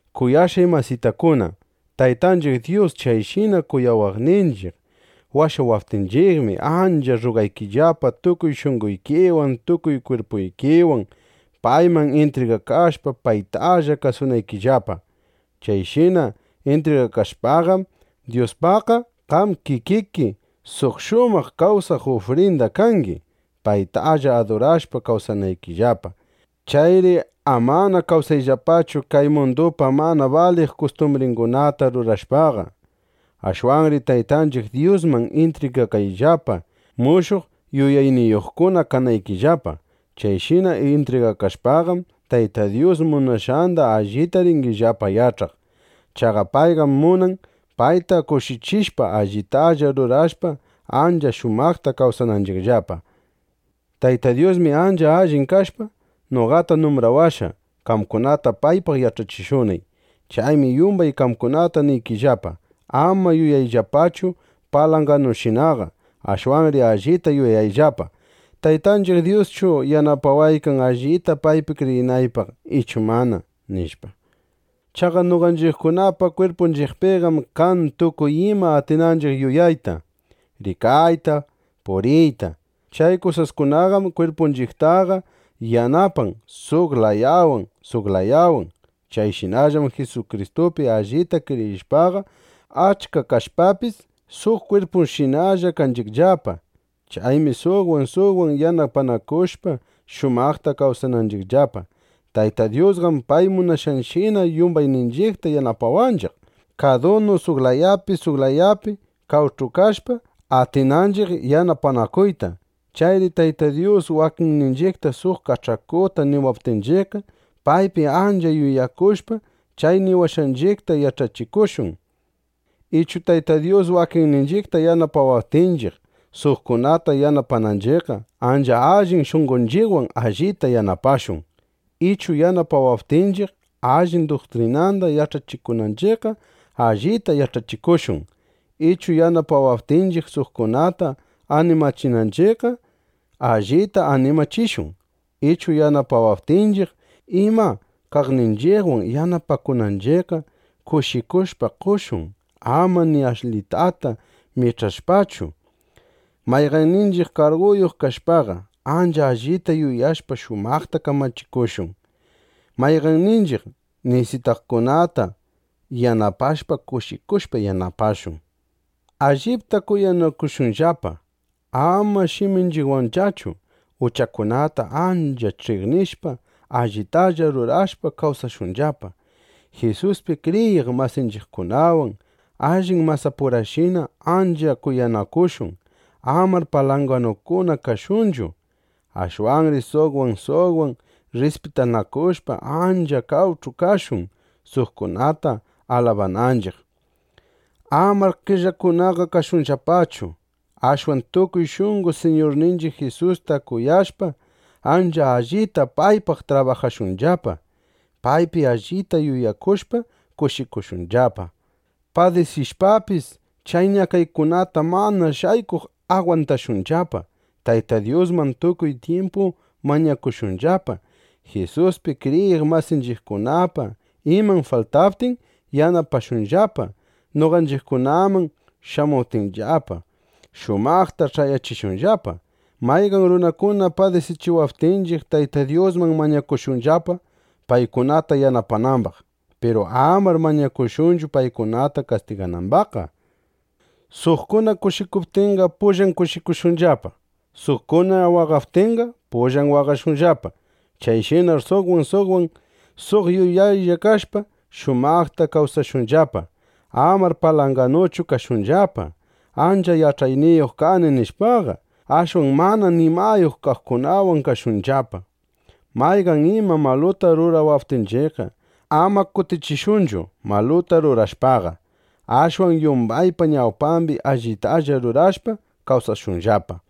Kuyashqay masitakuna, Taytanchiq Dyus chayshina kuyawaqninchiq washawaptinchiqmi, ancha rrugaykillapa, tukuy shunqoykiwan, tukuy kwirpuykiwan payman intrigakashpa, paytalla kasunaykillapa. Chayshina intrigakashpaqam, Dyuspaqqa qam kikiki suq shumaq kawsaq ufrinda kangi, paytalla adurashpa, kawsanaykillapa. Chayri amana kawsayllapachu kay mundupa mana baliq kustumbringunata rurashpaqa. Ashwanri Taytanchiq Dyusman intrigakayllapa, mushuq yuyayniyuqkuna kanaykillapa. Chayshina intrigakashpaqam, Tayta Dyus munashqanda allita ringillapa yach'aq. Chaqa payqam munan, payta kushichishpa, allitalla rurashpa, ancha shumaqta kawsananchiqllapa. Tayta Dyusmi, ancha allin kashpa, noqata numbrawashqa, qamkunata paypaq yach'achishunay. Chaymi yumbay qamkunata niykillapa: Ama yuyayllapachu palanganushinaqa. Ashwanri allita yuyayllapa: ¿Taytanchiq Dyuschu yanapawaykan, allita paypi kriyinaypaq ichu mana? nishpa. Chaqa noqanchiqkunapa kwirpunchiqpiqam kan tukuy ima atinanchiq yuyayta, rikayta, puriyta. Chay kusaskunaqam kwirpunchiqtaqa yanapan suq layawan, suq layawan. Chayshinallam Jisukristupi allita kriyishpaqa, achka kashpapis, suq kwirpushinallana kanchiqllapa. Chaymi suqwan suqwan yanapanakushpa, shumaqta kawsanchiqllapa. Tayta Dyusqam pay munashqanshina yumbayninchiqta yanapawanchiq, kadunu suq layapi suq layapi qawch'u kashpa, atinanchiq yanapanakuyta. Chayri Tayta Dyus wakinninchiqta suq kach'akuta niwaptinchiqqa, paypi ancha yuyakushpa, chay niwashqanchiqta yach'achikushun. Ichu Tayta Dyus wakinninchiqta yanapawaptinchiq, suqkunata yanapananchiqqa, ancha allin shunqonchiqwan allita yanapashun. Ichu yanapawaptinchiq allin duktrinanda yach'achikunanchiqqa, allita yach'achikushun. Ichu yanapawaptinchiq, suqkunata animachinanchiqqa, allita animachishun. Ichu yanapawaptinchiq ima kaqninchiqwan yanapakunanchiqqa, kushikushpa qoshun, ama ni ashlitata mich'ashpachu. Mayqanninchiq karguyuq kashpaqa, ancha allita yuyashpa, shumaqta kamachikushun. Mayqanninchiq nisitaqkunata yanapashpa, kushikushpa yanapashun. Allipta kuyanakushunllapa, ama shiminchiqwanllachu. Uchakunata ancha ch'iqnishpa, allitalla rurashpa, kawsashunllapa. Jisuspi kriyiq masinchiqkunawan allin masapurashina ancha kuyanakushun. Amar palanganukuna kashunchu. Ashwanri suqwan suqwan rrispitanakushpa, ancha qawch'u kashun, suqkunata alabananchiq. Amar qellakunaqa kashunllapachu. Ashwan tukuy shunqo Siñurninchiq Jisusta kuyashpa, ancha allita paypaq trabajashunllapa. Paypi allita yuyakushpa, kushikushunllapa. Padisishpapis, chay ñakaykunata mana shaykuq agwantashunllapa. Tayta Dyusman tukuy tyimpu mañakushunllapa. Jisuspi kriyiq masinchiqkunapa iman faltaptin, yanapashunllapa. Noqanchiqkunaman shamuptinllapa, shumaqta ch'ayachishunllapa. Mayqan runakuna padisichiwaptinchiq, Tayta Dyusman mañakushunllapa, paykunata yanapanambaq. Piru amar mañakushunchu, paykunata kastiganambaqqa. Suqkuna kushikuptinqa, pullan kushikushunllapa. Suqkuna waqaptinqa, pullan waqashunllapa. Chayshinar suqwan suqwan suq yuyaylla kashpa, shumaqta kawsashunllapa. Amar palanganuchu kashunllapa: Ancha yach'ayniyuq kani, nishpaqa. Ashwan mana nimayuq kaqkunawan kashunllapa. Mayqan ima maluta rurawaptinchiqqa, ama kutichishunchu, maluta rurashpaqa. Ashwan yumbaypa ñawpambi allitalla rurashpa, kawsashunllapa.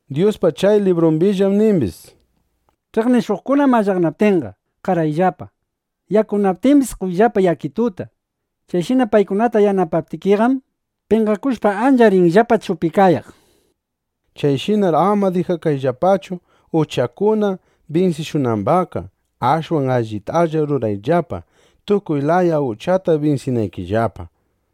Dyuspa chay librumbillam nimbis: “Ch'iqnishuqkuna mallaqnaptinqa, qarayllapa. Yakunaptimbis, qoyllapa yakituta. Chayshina paykunata yanapaptikiqam, penqakushpa, ancha rinllapa chupikayaq” nishpa. Chayshinar ama dijakayllapachu, uchakuna binsishunambaqqa; ashwan allitalla rurayllapa, tukuy laya uchata binsinaykillapa.